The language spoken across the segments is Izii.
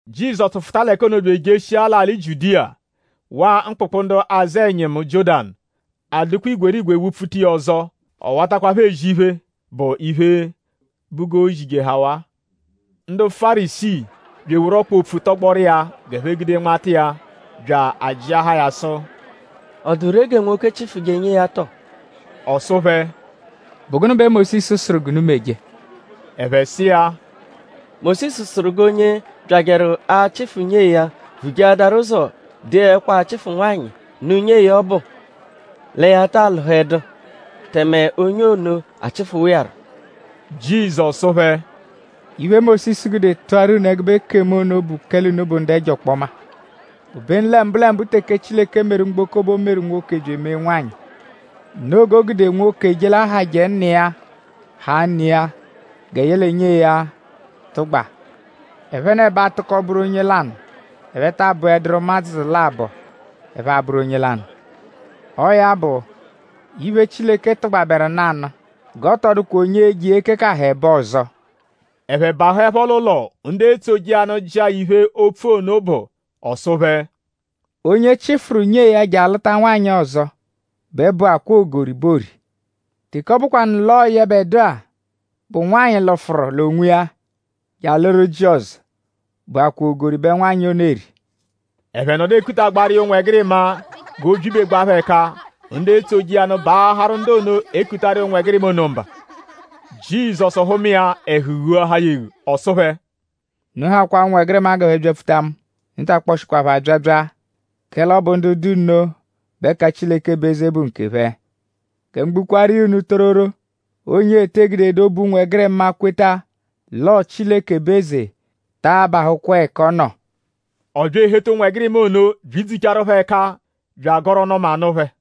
Jizọsu fụta l'ẹka ono bya ejeshia l'alị Jiudiya; waa mkpụkpu ndu azụ ẹnyimu Jiọ́danu. A dụkwa igwerigwe wụ-pfuta iya ọzo. Ọ watakwa phẹ ezi iphe, bụ iphe, bụ g'o zijehawaa. Ndu Fárisii bya eworu ọkpa opfu tọgboru iya g'ẹphe gude nmata iya bya ajịahaa ya sụ: “?Ọ dụ ree gẹ nwoke chịfuje nyee ya tọ?” Ọ sụ phẹ: “?Bụ gụnu bẹ Mósisu sụru unu g'unu meje?” Ẹphe sụ iya: “Mósisu sụru g'onye byajẹru achịfu nyee ya vujeadaru ụzo dee ẹkwo-achịfu-nwanyị nụ nyee ya ọbu lẹ ya ta alụhedu tẹme onye ono achịfuwa iya rọ.” Jizọsu sụ phẹ: “Iphe, Mósisu gude tụaru unu ẹgube ekemu ono bụ kẹle unu bụ ndu ẹjo ọkpoma. Obenu lẹ mbụlembu teke Chileke meru mgboko bẹ o meru nwoke bya emee nwanyị. Noo g'o gude: nwoke je l'ahajẹ nna iya; haa ne iya gẹ yẹle nyee ya tụgba. Ẹphenebo atụko bụru onye lanụ. Ẹphe taa bụeduru ụmadzu labọ. Ẹphe abụru onye lanụ. Ọo ya bụ; iphe, Chileke tụgbaberu nanụ g'ọ tọ dụkwa onye e-je iya ekekaha ẹbo ọzo.” Ẹphe bahụepho l'ụlo; ndu etsoje iya nụ jịa ya iphe, opfu ono bụ. Ọ sụ phẹ: “Onye chịfuru nyee ya je alụta nwanyị ọzo bẹ bụakwaa ogori bẹ oori. Teke ọ bụkwanu l'ọo yẹbedua, bụ nwanyị lụfuru l'onwiya je alụru ji ọzo bụakwaa ogori bẹ nwanyị ono eri.” Ẹphe nọdu ekutagbaaru iya ụnwegirima g'o byibegbaa phẹ ẹka; ndu etsoje iya nụ baaharụ ndu ono, ekutaru iya ụnwegirima ono mba. Jizọsu hụma iya; ẹhu ghuahaa ya eghu. Ọ sụ phẹ: “Unu hakwaa ụnwegirima g'ẹphe byapfuta mu. Unu ta akpọshikwa phẹ abyabya; kẹle ọ bụ ndu dụ nno bẹ ẹka Chileke bụ eze bụ nkephẹ. Gẹ mu gbukwaaru iya unu tororo; onye ete gudedu obu ụnwegirima kweta l'ọo Chileke bụ eze taa bahụkwa ẹka ọ nọ.” Ọ bya eheta ụnwegirima ono byidzuchaaru phẹ ẹka bya agọru ọnu-ọma nụ phẹ.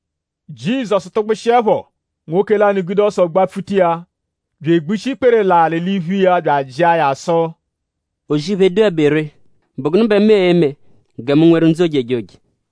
Jizọsu tụgbushiepho; nwoke lanụ gude ọso gbapfuta iya bya egbushi ikpere l'alị l'iphu iya bya ajịa ya sụ: “O-zì-iphe, dụebe ree;?bụ gụnu bẹ mu e-me gẹ mu nweru ndzụ ojejoje?”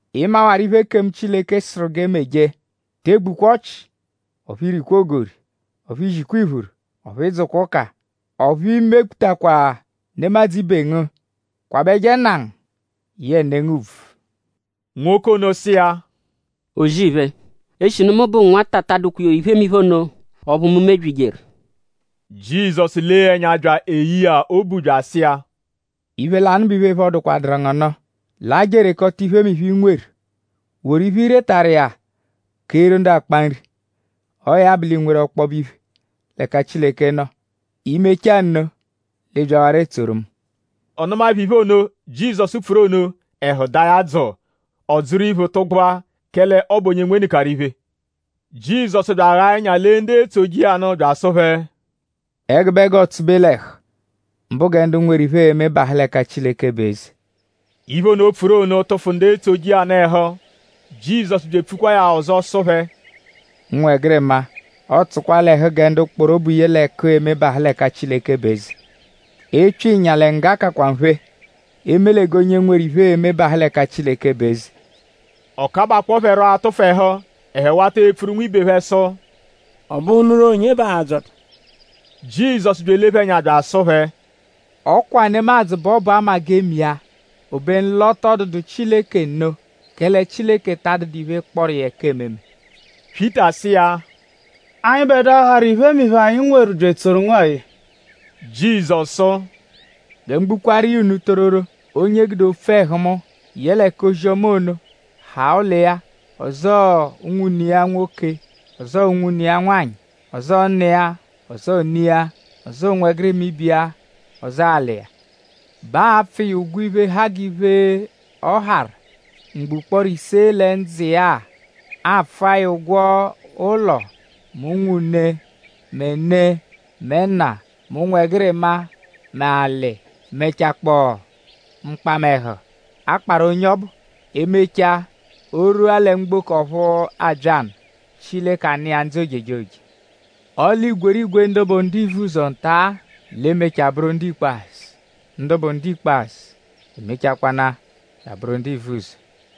Ị mawaru iphe, ekemu Chileke sụru g'e meje: ‘Te egbukwa ọchi; ọphu i rikwa ogori; ọphu i zikwa iphuru; ọphu ị dzụkwa ụka; ọphu i mekputakwa nemadzụ ibe ngu; kwabẹje nna ngu yẹe ne ngu ùbvù.’” Nwoke ono sụ iya: “O-zì-iphe; eshinu mu bụ nwata ta adụkwa iphemiphe ono ọphu mu mebyijeru.” Jizọsu lee ya ẹnya bya eyee ya obu bya asụ iya: “Iphe lanụ bụ iphe, phọdukwaduru ngu nụ: laa je erekọta iphemiphe, i nweru; woru iphe, i retaru iya keeru ndu akpa nri. Ọo ya bụ; l'ii-nweru ọkpobe iphe l'ẹka Chileke nọ. I -mechaa nno; l'ịi byawarọ etsoru mu.” Ọ nụmaepho iphe ono, Jizọsu pfuru ono; ẹhu daa ya dzụu; ọ dzụru iphu tụgbua; kẹle ọ bụ onye nwenụkaru iphe. Jizọsu bya aghaa ẹnya lee ndu etsoje iya nụ bya asụ phẹ: “Ẹgube g'ọo-tsụbe l'ẹhu; mbụ gẹ ndu nweru iphe e-me bahụ l'ẹka Chileke bụ eze.” Iphe ono, o pfuru ono tụfu ndu etsoje iya nụ ẹhu. Jizọsu bya epfukwaa ya ọzo sụ phẹ: “Ụnwegirima; ọo tsụkwa l'ẹhu gẹ ndu kpọru obu ye l'ẹku e-me bahụ l'ẹka Chileke bụ eze. Epyo ịnya l'ẹnya ngga kakwa nphe; eme lẹ g'onye nweru iphe e-me bahụ l'ẹka Chileke bụ eze.” Ọ kabakpọo phẹ rọ atụfu ẹhu. Ẹphe wata epfuru nwibe phẹ sụ: “?Ọ bụhunuru onye bẹ aa-dzọta?” Jizọsu bya elee phẹ ẹnya bya asụ phẹ: “Ọ kwa nemadzụ bẹ ọ bụ 'ama-g'ee-me-iya; obenu l'ọ tọ dụdu Chileke nno; kẹle Chileke ta adụdu iphe, kpọru iya ẹka ememe.” Pyịta sụ iya: “?Anyịbedua, harụ iphemiphe, anyi nweru bya etsoru ngu-a-e?” Jizọsu sụ: “Gẹ mu gbukwaaru iya unu tororo; onye gude opfu ẹhu mu; yẹle k'ozi-ọma ono haa ụlo iya; ọzoo unwune iya nwoke; ọzoo unwune iya nwanyị; ọzoo nna iya; ọzoo ne iya; ọzoo ụnwegirima ibe iya; ọzoo alị iya; bẹ aa-pfụ iya ụgwo iphe, ha g'iphe, ọ harụ mgbo ụkporo ise lẹ ndzụ iya-a. Aa-pfụ iya ụgwo ụlo mẹ unwune; mẹ ne; mẹ nna; mẹ ụnwegirima; mẹ alị; mẹchakpoo mkpamẹhu, a kparụ onye ọbu. E -mechaa; o -rwua lẹ mgboko ọphu abya nụ; Chileke anụ iya ndzụ ojejoje. Ọle igwerigwe ndu bụ ndu ivuzọ nta-a l'e-mechaa bụru ndu ikpazụ; ndu bụ ndu ikpazụ emechakwanaa bya abụru ndu ivuzọ.”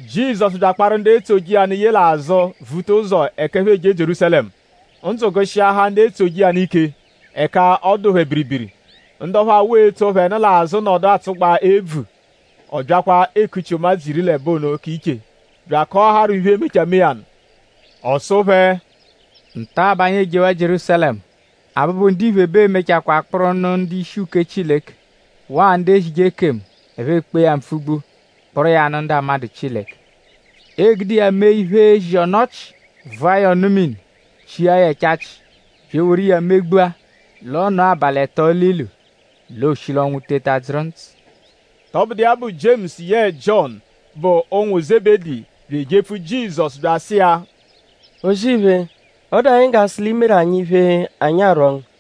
Jizọsu bya akparu ndu etsoje iya nụ ye l'azụ vuta ụzo ẹka ẹphe eje Jierúsalẹmu. Ndzụ gụ-shiahaa ndu etsoje iya nụ ike; ẹka ọ dụ phẹ biribiri. Ndu ọphu awụ etso phẹ nụ l'azụ nọdu atsụgbaa ebvu. Ọ byakwa ekuchi ụmadzu iri l'ẹbo ono iche bya akọaharu phẹ iphe, e-mechaa mee ya nụ. Ọ sụ phẹ: “Nta-a bẹ anyi ejewaa Jierúsalẹmu. Abụbu-Ndiphe bẹ ee-mechakwaa kpụru nụ ndu-ishi uke Chileke waa ndu ezije ekemu. Ẹphe ekpee ya mpfugbu kpụru iya nụ ndu amadụ Chileke. Ee-gude iya mee iphe, ezi ọnu-ọchi; vụa ya ọnu-mini; chia ya ẹchachi; bya eworu iya megbua; l'ọ nọo abalị ẹto l'ilu; l'ooshi l'ọnwu teta dzụru ndzụ.” “Tọbudu iya bụ; Jiemusu yẹe Jiọnu, bụ ụnwu Zebedi bya ejepfu Jizọsu bya asụ iya: O-zì-iphe; ọ dụ anyi g'a sụ l'ii-meru anyi iphe, anyi a-rwọ ngu.”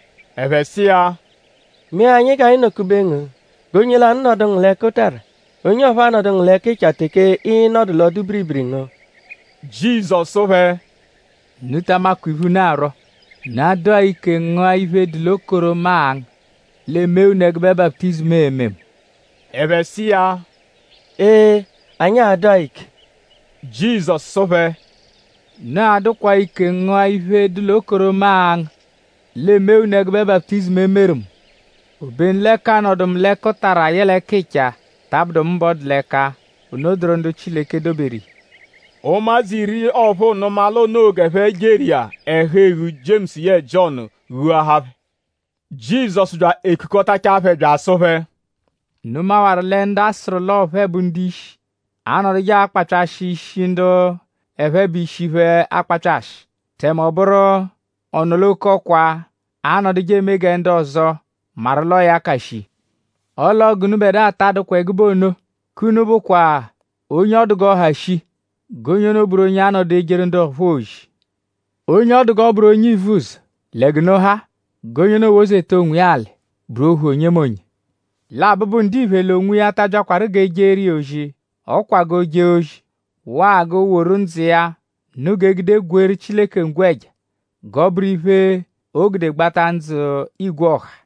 Ẹphe sụ iya: “Mee anyi g'anyi nọ-kube ngu: g'onye lanụ nọdu ngu l'ẹkutara; onye ọphuu anọdu ngu l'ẹkicha teke ịi-nọdu l'ọ-dụ-biribiri ngu.” Jizọsu sụ phẹ: “Unu ta amakwa iphe, unu arwọ.?Unu a-dụ-a ike ngụa iphe, dụ l'okoro, mu a-ngụ; l'e mee unu ẹgube baputizimu, ee-me mu?” Ẹphe sụ iya: “Ee! Anyi a-dụ-a ike.” Jizọsu sụ phẹ: “Unu a-dụkwa-a ike ngụa iphe, dụ l'okoro, mu a-ngụ; l'e mee unu ẹgube baputizimu, e meru mu. Obenu lẹ k'anọdu mu l'ẹkutara yẹle ẹkicha ta abụdu mu bẹ ọ dụ l'ẹka. Ono dụru ndu Chileke doberu iya.” Ụmadzu iri ọphuu nụma l'o noo g'ẹphe jeru iya; ẹhu-eghu Jiemusu yẹe Jiọnu ghuahaa phẹ. Jizọsu bya ekukọtachaa phẹ bya asụ phẹ: “Unu mawaru lẹ ndu a sụru l'ọo phẹ bụ ishi anọduje akpapyashị ishi ndu ẹphe bụ ishi phẹ akpapyashị; tẹme ọ bụru ọ-nọ-l'oke-ọkwa anọduje eme gẹ ndu ọzo maru l'ọo ya ka shii. Ọle ọo gẹ k'unubẹdua ta adụkwa ẹgube ono. K'unu bụkwa; onye ọ dụ g'ọ ha shii; g'onye ono bụru onye a-nọdu ejeru ndu ọphuu ozi. Onye ọ dụ g'ọ bụru onye ivuzọ lẹ g'unu ha; g'onye ono wozeta onwiya alị; bụru ohu onyemonye. Lẹ Abụbu-Ndiphe l'onwiya ta abyakwaru g'e jeeru iya ozi; ọ kwa g'o jee ozi; waa g'o woru ndzụ iya nụ g'e gude gweeru Chileke ngwẹja; g'ọ bụru iphe, oo-gude gbata ndzụ igwe ọha.”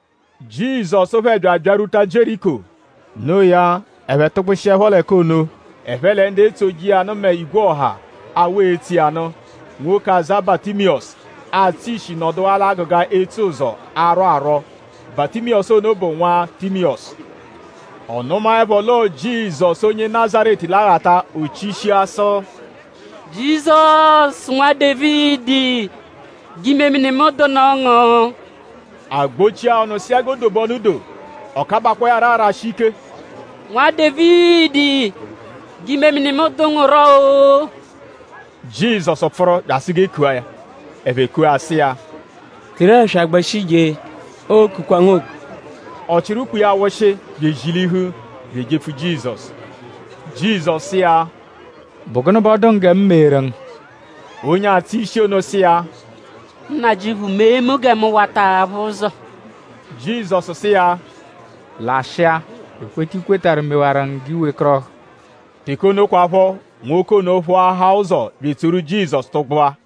Jizọsu phẹ bya abyarwuta Jieriko. Noo ya; ẹphe tụgbushiepho l'ẹka ono; ẹphe lẹ ndu etsoje iya nụ mẹ igwe ọha, awụ etso iya nụ. Nwoke, aza Batimiyọsu, atsụ ishi nọduwaa l'agụga etsuzọ; arwọ arwọ. Batimiyọsu ono bụ nwa Timiyọsu. Ọ nụmaepho l'ọo Jizọsu onye Nazaretu l'aghata; o chishia sụ: “Jizọsu; Nwa Dévidi; g'imemini mu dụnu ngu!” A gbọchia ya ọnu sụ iya g'o dobe ọnu doo. Ọ kabakpọo ya rọ arashi ike: “Nwa Dévidi; g'imemini mu dụ ngu rọ-o!” Jizọsu pfụru bya asụ g'e kua ya. Ẹphe kua ya sụ iya: “Teru ẹswa gbẹshi je; ookukwa ngu oku.” Ọ chịru ukpo iya wụshi bya ezilihu bya ejepfu Jizọsu. Jizọsu sụ iya: “?Bụ gụnu bẹ ọ dụ ngu gẹ mu meeru ngu?” Onye atsụ ishi ono sụ iya: “Nnajịuphu! Mee mu gẹ mu wata aphụ ụzo!” Jizọsu sụ iya: “Lashịa. Ekweta, i kwetarụ mewaru ngu g'i wekọrohu.” Teke ono kwaphọ; nwoke ono phụahaa ụzo bya etsoru Jizọsu tụgbua.